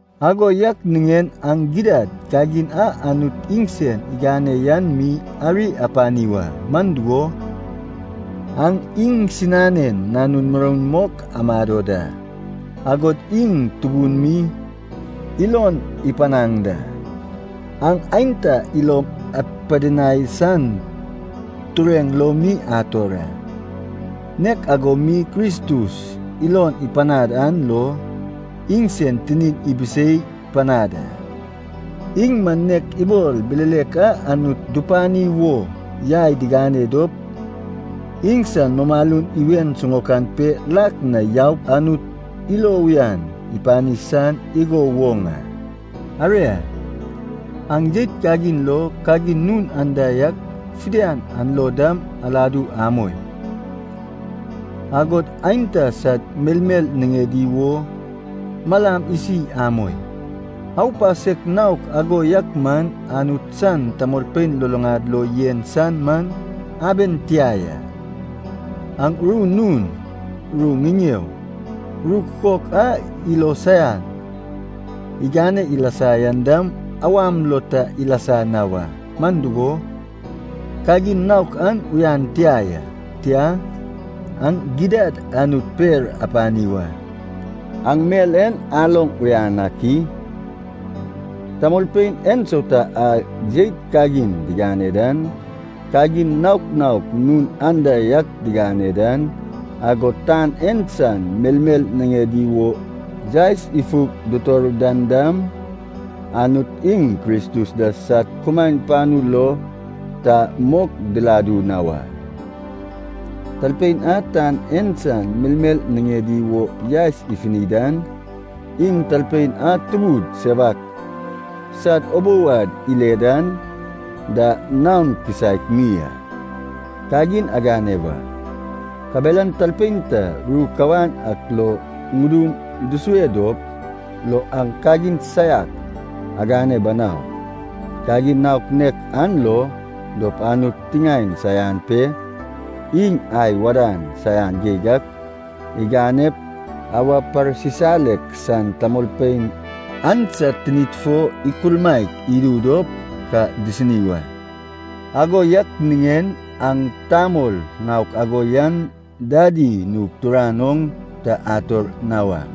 Ago yak niŋen aŋ gidad kagin a Anut iŋsen igane yan mi ari apani wa, man dugo, aŋ iŋsinanen nanun muroun mok amado da, agod iŋ tubun mi ilon ipanaŋ da. Aŋ aenta ilom apidinai san tureŋ lo mi ator a, nek ago mi Kristus ilon ipanad an lo iŋsen tinin ibisei panad a. Iŋ man nek ibol bilelek a Anut dupani wo yai digane dop iŋsan mumalun iwen siŋaokan pe lak na yaup Anut ilo uyan ipani san igo woŋ a. Aria, aŋ jeit kagin lo, kagin nun anda yak fidian an lo dam aladu amoi. Agod aenta sad melmel niŋedi wo malam isi amoi. Aupasek naok ago yak man Anut san tamolpein luluŋad lo yen san man aben tia ya. Aŋ ru nun, ru ŋiŋeo, ru kukok a ilo saian igane ilasa yan dam awam lo ta ilasa na wa, man dugo, kagin naok an uyan tia ya. Tia, aŋ gidad Anut per apani wa. Aŋ mel en aloŋ uyan ak i? Tamolpein ensauta a jeit kagin digane dan, kagin naok naok nun anda yak digane dan, agod tan en san melmel niŋedi wo yaes ifug ditor dan dam, Anut iŋ Kristus da sad kumaen panu lo ta mok diladu na wa. (Talpein a tan en san melmel niŋedi wo yaes ifuni dan, iŋ talpein a tubud sewak sad ubou ad ile dan da naon kisaek mi a.) Kagin agane wa, kabelan talpein ta ru kawan ak lo ŋudum dusue dop lo aŋ kagin saiak agane banau. Kagin naok nek an lo dop Anut tiŋaen saian pe iŋ ai wadan saian geig ak iganep awa parsisalek san tamolpein an sad tinid fo ikulmaek idu dop ka disini wa. Ago yak niŋen aŋ tamol naok ago yan dadi nug turan oŋ ta ator na wa.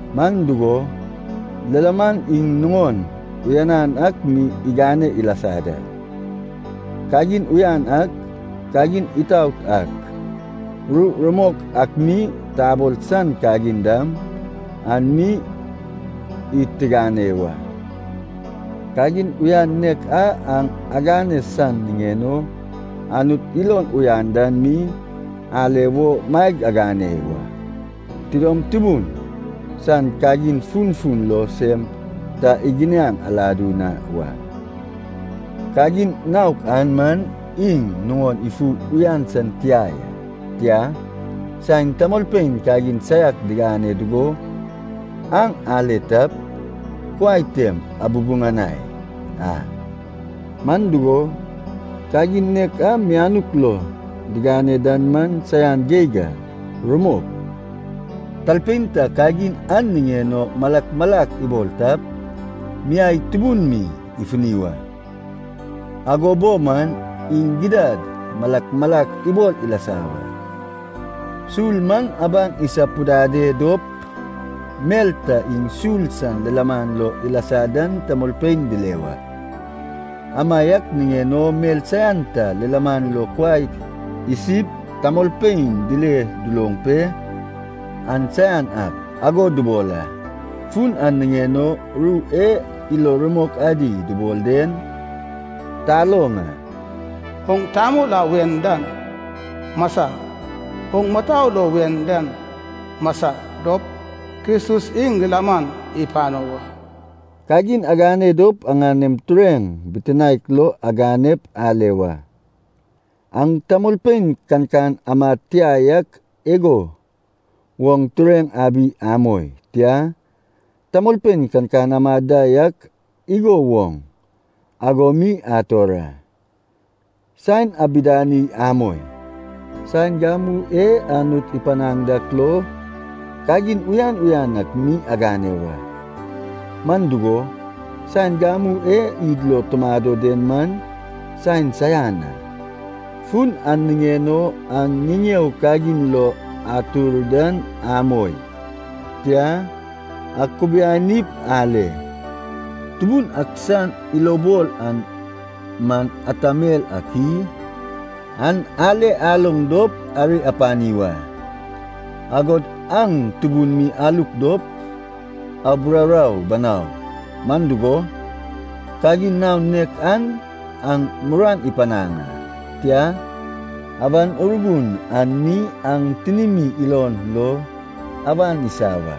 Man dugo, lilaman iŋ nuŋon uyanan ak mi igane ilasa da, kagin uyan ak, kagin itaot ak, ru rumok ak mi tabol san kagin dam, an mi id tigane wa. Kagin uyan nek a aŋ agane san niŋen o Anut ilon uyan dan mi ale wo maeg agane wa. Tidom tubun san kagin funfun lo sem ta iginiaŋ aladu na wa. Kagin naok an man iŋ nuŋon ifu uyan san tia ya. Tia, saen tamolpein kagin saiak digane dugo aŋ ale tap, kuai tem abubuŋanai a. Man dugo, kagin nek a mianuk lo digane dan man saian geig a. Rumok, talpein ta kagin an niŋen o malak malak ibol tap, miai tubun mi ifuni wa. Ago bo man, iŋ gidad malak malak ibol ilasa wa. Sul man abaŋ isapudade dop mel ta iŋ sul san lilaman lo ilasa dan tamolpein dile wa. Amaiak niŋen o mel saian ta lilaman lo kuai isip tamolpein dile duloŋ pe “an saian ak” ago dubol a. Fun an niŋen o ru e ilo rumok adi dubol den taloŋ a, “Oŋ tamol a wen dan, masa. Oŋ mutou lo wen dan masa dop, Kristus iŋ lilaman ipano wa.” Kagin agane dop aŋanem tureŋ bitinaek lo aganep ale wa. Aŋ tamolpein kankan amad tia yak igo woŋ tureŋ abi amoi, tia, tamolpein kankan amad da yak igo woŋ ago mi ator a. Saen abidani amoi. Saen gamu e Anut ipanaŋ dak lo, kagin uyan uyan ak mi agane wa, man dugo, saen gamu e id lo tumado den man saen saian a. Fun an niŋen o aŋ ŋiŋeo kagin lo atur dan amoi. Tia, akubianip ale, Tubun ak san ilobol an man ata mel ak i? An ale aloŋ dop ari apani wa. Agod aŋ tubun mi aluk dop, aburaurau banau, man dugo, kagin naon nek an aŋ muruan ipanaŋ a. Tia, Awan Urgun an mi aŋ tinimi ilon lo awan isa wa.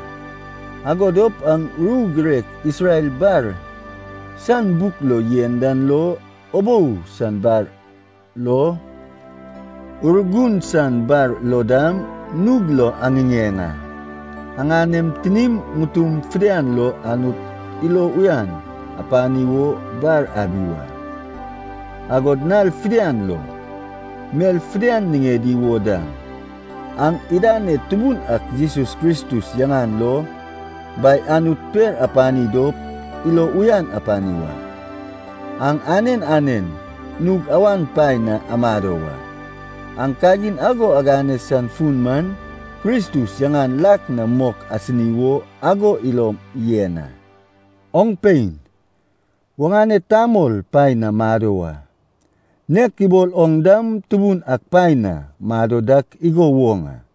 Ago dop aŋ ru girek Isrel bar san buk lo yen dan lo, ubou san bar lo, Urgun san bar lo dam nug lo aŋiŋeŋ a. Aŋanem tinim ŋutum fidian lo Anut ilo uyan apani wo bar abi wa. Agod nal fidian lo, mel fidian niŋedi wo dam, aŋ idaned Tubun ak Jesus Kristus yaŋan lo, Bai Anut per apani dop ilo uyan apani wa. Aŋ anen anen nug awan paen na amado wa. Aŋ kagin ago agane san fun man, Kristus yaŋan lak na mok asini wo ago ilom yen a. Oŋ pein, oŋane tamol paen na mado wa, nek ibol oŋ dam Tubun ak paen na mado dak igo woŋ a.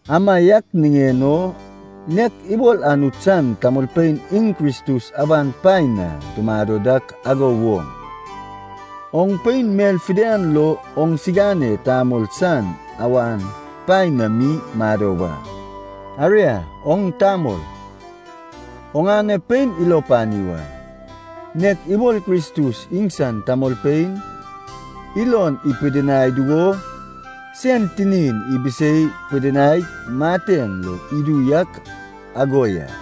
Amaiak niŋen o, nek ibol Anut san tamolpein iŋ Kristus awan paen na dumado dak ago woŋ, oŋ pein mel fidian lo oŋsigane tamol san awan paen na mi mado wa. Aria oŋ tamol, oŋane pein ilo pani wa, nek ibol Kristus iŋsan tamolpein ilon ipidinai dugo sen tinin ibisei pidinaig mateŋ lo idu yak ago ya.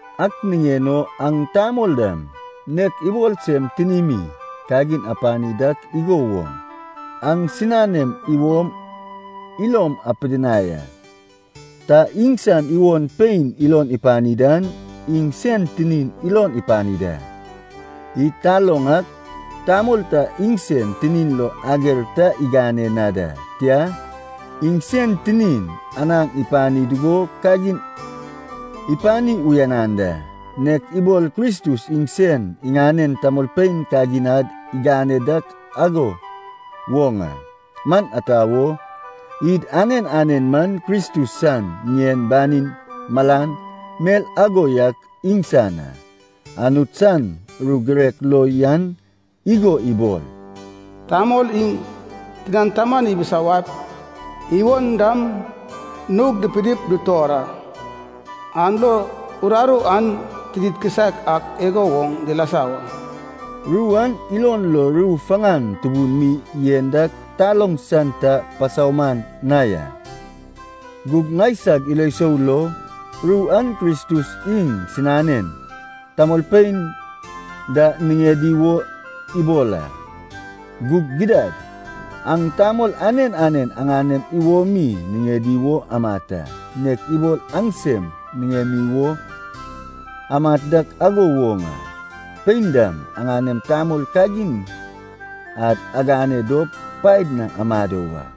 Ak niŋen o aŋ tamol dam, nek ibol sem tinimi kagin apani dak igo woŋ, aŋsiŋanem iwom ilom apidinai a. Ta iŋsan iwon pein ilon ipani dan, iŋ sen tinin ilon ipani da. Id taloŋ ak, tamol ta iŋsen tinin lo ager ta igane na da. Tia, iŋ sen tinin anaŋ ipani dugo kagin ipani uyanan da, nek ibol Kristus iŋsen iŋanen tamolpein kagin ad igane dak ago woŋ a. Man ata wo, id anen anen man Kristus san ŋien banin malan, mel ago yak iŋsan a. Anut san ru girek lo yan igo ibol. “Tamol iŋ tinan taman ibisawaip iwon dam nug dipinip dutor a. An lo uraru an tinid kisaek ak igo woŋ dilasa wa.” Ru an ilon lo ru faŋan tubun mi yen dak taloŋ san ta pasauman na ya. Gug ŋaisag ilo sou lo, ru an Kristus iŋ sinanen tamolpein da niŋedi wo ibol a. Gug gidad, aŋ tamol anen anen aŋanem iwomi niŋedi wo amat a, nek ibol aŋsem niŋemi wo amat dak ago woŋ a. Pein dam aŋanem tamol kagin ad agane dop paed na amado wa.